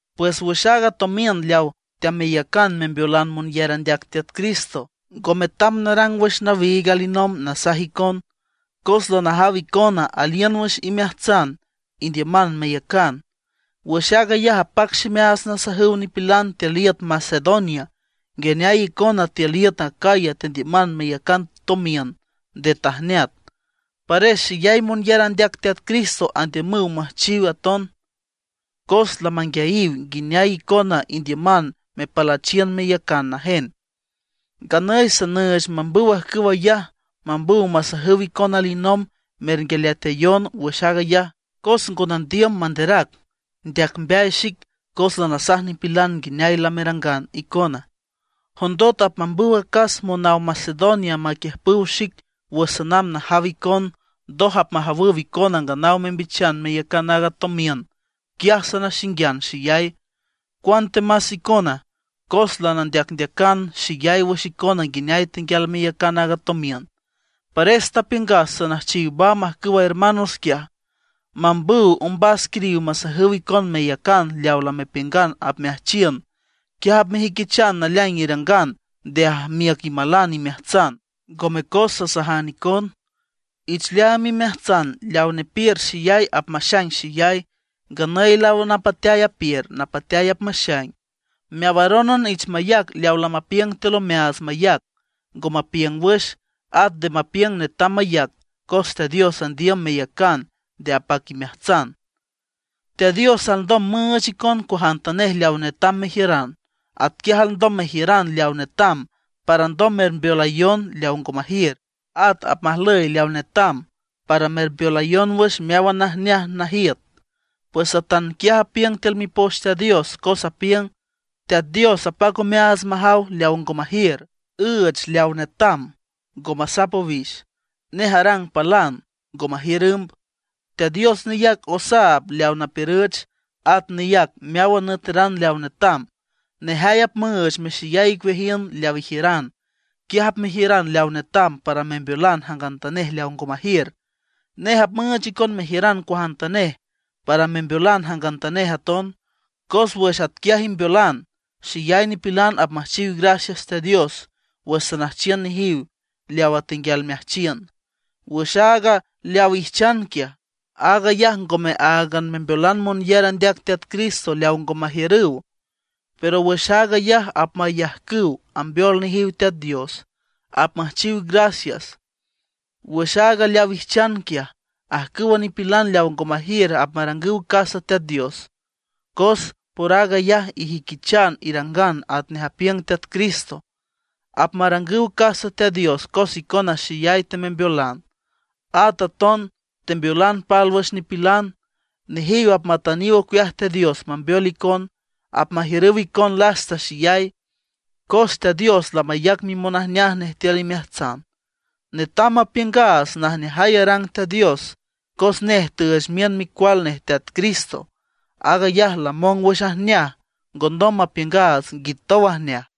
Pues wüx aaga tomiün leaw teameyacan membeolan monyar andeac Teat Cristo, ngo metam narang wüx nawiig alinomb nasaj icon. Cos lanajaw icona aliün wüx imeajtsan indiüman meyacan. Wüx aag ayaj apac ximeaats nasajüw nipilan tiül iüt Macedonia nguineay icona tiül iüt Acaya tendiüman meyacan tomiün nde tajneat. Pares xeyay monyar andeac Teat Cristo andiümüw müjchiw aton, cos lamanguiayiw nguineay icona indiüman mepalüchiün meyacan najen. Nganüy sanüüch mambüw ajcüw ayaj, mambüw masajüw icon alinomb mernguialeatayon wüx aag ayaj, cos ngo nandiüm manderac ndeac mbeay xic cos lanasajan nipilan nguineay lamerangan icona. Jondot apmambüw acas monaw Macedonia maquiüjpüw xic wüx sanamb najaw icon, ndoj apmajawüw icona nganaw membichan meyacan aaga tomiün, quiaj sanaxinguian xeyay, cuantemas icona. Cos lanandeacndeacan xeyay wüx icona nguineay tenguial meyacan aaga tomiün. Pares tapiüngas sanüjchiw mamb ajcüwa hermanos quiaj, mambüw ombas quiriw masajüw icon meyacan leaw lamepiüngan apmeajchiün. Quiaj apmejüiquichan naleaing irangan nde ajmiüc imalan imeajtsan, ngome cos sasajan icon. Ich leaam imeajtsan, leaw nepiür xeyay apmaxaing xeyay; nganüy leaw napateay apiür, napateay apmaxaing. Meawarónan ich mayac leawa lamapiüng tiül omeaats mayac, ngo mapiüng wüx; at nde mapiüng netam mayac, cos Teat Dios andiüm meyacan nde apac imeajtsan. Teat Dios alndom müüch icon cuajantanej leaw netam mejiüran. Atquiaj alndom mejiüran leaw netam para alndom mermbeolayon leaw ngo majiür. At apmajlüy leaw netam para mermbeolayon wüx meáwan najneaj najiüt. Pues atanquiaj apiüng tiül Mipoch Teat Dios, cos apiüng: Teat Dios apac omeaats majaw leaw ngo majiür, üüch leaw netam, ngo masap owix. Nej arang palan, ngo majiür ümb. Teat Dios neyac osaab leaw napiürüch, at neyac meáwan nüeteran leaw netam; nejay apmüüch mexeyay icueajiün leaw ijiüran. Quiaj apmejiüran leaw netam para membeolan jangantanej leaw ngo majiür. Nej apmüüch icon mejiüran cuajantanej, para membeolan jangantanej aton. Cos wüx atquiaj imbeolan, xeyay nipilan apmüjchiw gracias Teat Dios wüx sanüjchiün nejiw leawa tenguial meajchiün. Wüx aaga leaw ijchan quiaj, aag ayaj ngome áagan membeolan monyar andeac Teat Cristo leaw ngo majiürüw, pero wüx aag ayaj apmayajcüw ambeol nejiw Teat Dios, apmüjchiw gracias. Wüx aaga leaw ijchan quiaj, ajcüwa nipilan leaw ngo majiür apmarangüw casa Teat Dios, cos por aag ayaj ijüiquichan irangan atnej apiüng Teat Cristo. Apmarangüw casa Teat Dios cos icona xeyay temembeolan; at aton tembeolan pálwüx nipilan. Nejiw apmatüniw ocueaj Teat Dios mambeol icon, apmajiürüw icon lasta xeyay, cos Teat Dios lamayac mimonajneaj nej tiül imeajtsan. Netam mapiüngaats najneajay arang Teat Dios cos nej tüüch miün micual nej Teat Cristo. Aag ayaj lamong wüx ajneaj, ngondom mapiüngaats nguitow ajneaj.